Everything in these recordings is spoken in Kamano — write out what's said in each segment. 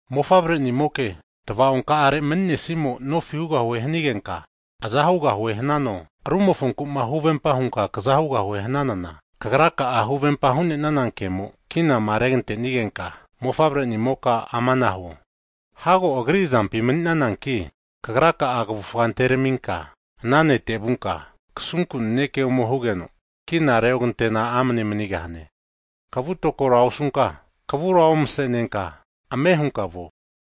Mofavrenimoke, tva'onkarema nemanisimo'ma nofi hugahue hanigenka aza hugahue hananano, rumofonku'ma huvempa hunka kaza hugahuema hananana, kagraka'a huvempama hu'nenana kemo kinama regatenigenka, mofavre'nimoka amana huo, hago agri azampi mani'nananki kagra'a kavufa anteraminka ana nete vunka, kasunku naneke ome hugeno kina reogantena amne manigahane. Kavu tokora osunka, kavura omasenenka, ame hunka vuo.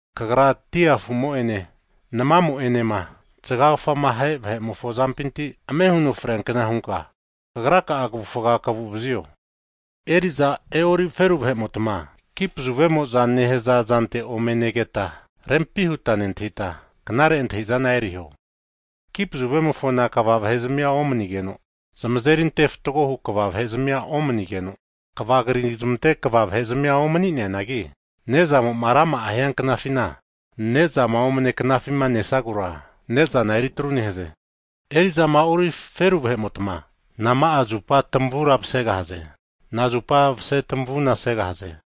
Kagra dia afumo'ene namamo enema zgagfama ahe vahe'mofo azampinti ame huno freankna hunka, kagra'a kavufga kaguvazio. Eri'zama e'ori feru vahe'motma kipazuvemoza nehaza zante ome negeta, rempi huta nentahita, knare antahizana eriho. Kipazuvemofona kva vahe'zmia omanigeno, zamazeri ante fatgohu kva vahe zamia omanigeno, kvama krizamante kva vahe zamia omani'neanagi, ne'zamo'ma rama'ama fore hianknafina nezama omane knafima nesagura, nezana eri atru nehaze. Eri'zama e'ori feru vahe'motma, nama'a zupa tamavura masegahaze? Nazupa masetamavuna segahaze?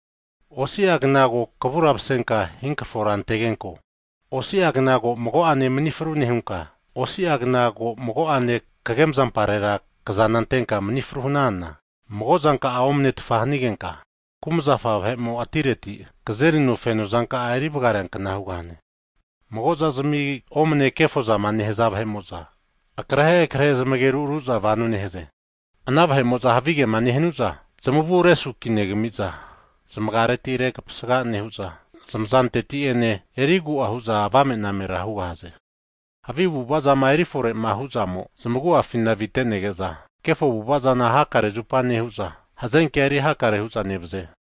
Osiagna ko kavura masenka hinkrafora antegenko, osiagna ko mago'ane manifru nehunka, osiagna ko mago'ane kagemazampare kazana antenka manifru hananana, mago zanka'a omanetfa hanigenka, kumazafa vahemo atireti kazerino fenozanka'a erivgareankna hugahane. Mago zazmi omane kefozama nehaza vahe'mo'za akrehe krehe zmageru aruza vano nehaze. Ana vahe'mo'za havigema nehanuza zamavu resukinegamiza, zmagiareti rekapasga nehu'za, zmazanteti ene erigu'a hu'za avame'namera hugahaze. Havi avu'avazama erifore'ma hu'zamo zamagu'afina avitenege'za, kefo avu'avazana hakare zupa nehu'za, hazenkea eri hakare hu'za nevaze.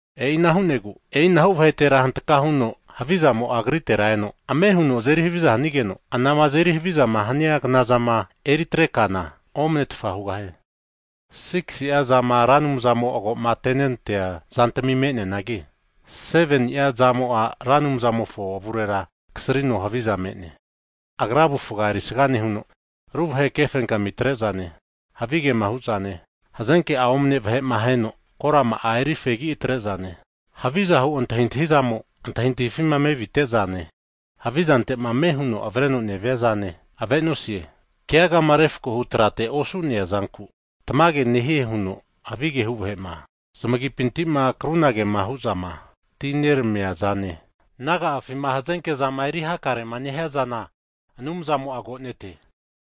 E'ina hu'negu e'inahu vahetera hantka huno havizamo'a agritera eno, ame huno azeri haviza hanigeno, anama azeri havizama hania knazama eritre kana omanetfa hugahie. Sigisi'a zama Ra Anumzamo ago'matenentea zantami me'neanagi, seveni'a zamo'a Ra Anumzamofo avurera kasrino haviza me'ne. Agra avufga erisga nehuno, ru vahe kefenkami atre'zane, havigema hu'zane, hazenke'a omane vahe'ma aheno korama'a eri fegi atre'zane, havi antahintahizamo antahintahifima mevite'zane, havi zante'ma ame huno avreno neviazane ave'nosie. Keagama refkohu trate osu'nea zanku tamage nehie huno havige hu vahe'ma, zamagipintima krunagema hu'zama atineramia zane, naga'afima hazenke zama eri hakare nehiazana Anumzamo'a agonete.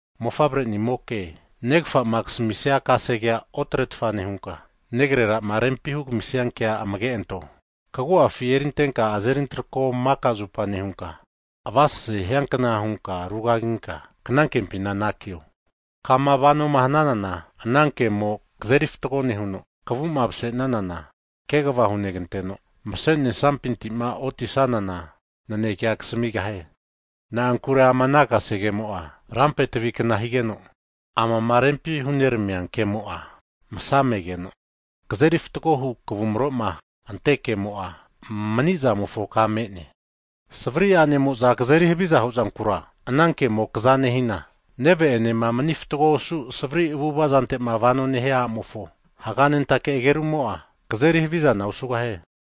Mofavrenimoke, negfa'ma kasamisia kasegea otretfa nehunka, negrera'ma rempi hugamisia kea amge'anto. Kagu'afi erintenka azeri antakro maka zupa nehunka, avaseseza hiankna hunka rugaginka knankempi anakio. Kama vanoma hananana ana kemo kazeri fatgo nehuno, kavu'ma masesanana kegva huneganteno, masenesampintima oti'sanana nanekea kasamigahie. Na'ankure ama ana kasegemo'a rampe tavikna higeno, amama rempima huneramia kemo'a msa megeno, kazeri fatgohu kavumroma antea kemo'a, manizamofo ka me'ne. Savri a'nemo'za kazeri hava huzankura ana kemo kza nehina, neve'enema mni fatgo osu savari avu'avazante vanoma nehania a'mofo haganentake ageru'mo'a kazeri havizana osugahie.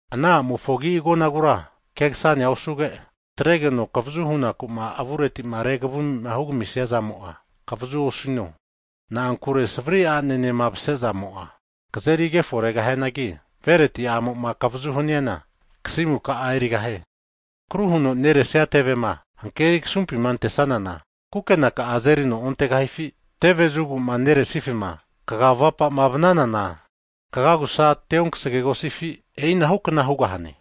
Ana a'mofo agi agonagura kegasanea osuge, atregeno kavazu hunaku'ma avuretima revumima hugamisia zamo'a kavazua osino. Na'ankure savri a'enema mase zamo'a kazeri kefo regahianagi, vereti a'mo'ma kavazu haniana kasimu ka'a erigahie. Akru huno neresia tevema hankeri kasumpima antesanana kukenaka'a azerino ontegahifi? Teve zugu'ma neresifima kaga vapama vananana, kagagusa teonkasagegosifi? E'ina hukna hugahane,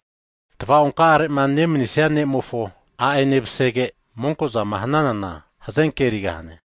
tava'onka'arema nemanisia ne'mofo a'enema masege, monkozama hananana hazenke erigahane.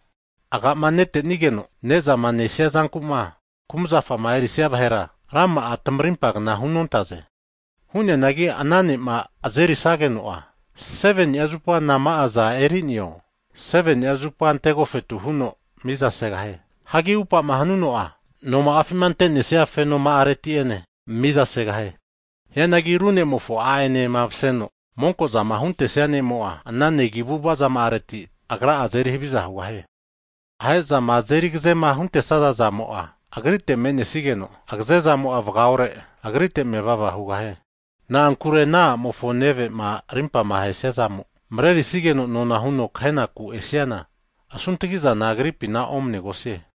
Aga'ma netenigeno nezama nesia zankuma kumzafama erisia vahera, rama'a tamarimpa kna hunontaze. Hu'neanagi ana ne'ma azerisageno'a, seveni'a zupa nama'aza eri'neo seveni'a zupa antegofetu huno miza segahie. Hagi upama hanuno'a, no'ma'afima ante'nesia fenoma'areti ene mizasegahie. Hianagi ru ne'mofo a'enema maseno monkozama huntesia ne'mo'a, ana negi' avu'ava zama'areti agra'a azeri haviza nehie. Ahe'zama azeri agazema huntesaza zamo'a, agrite me'nesigeno agaze zamo'a vgaore agrite mevava hugahie. Na'ankure ana a'mofo neve'ma rimpama ahesia zamo marerisigeno nona huno kahenaku esiana asuntagizana agripina omanegosie.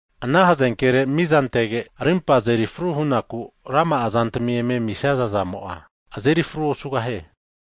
Ana hazenkere miza antege, rimpa azeri fru hu'naku rama'a zantami eme amisia zamo'a, azeri fru osugahie.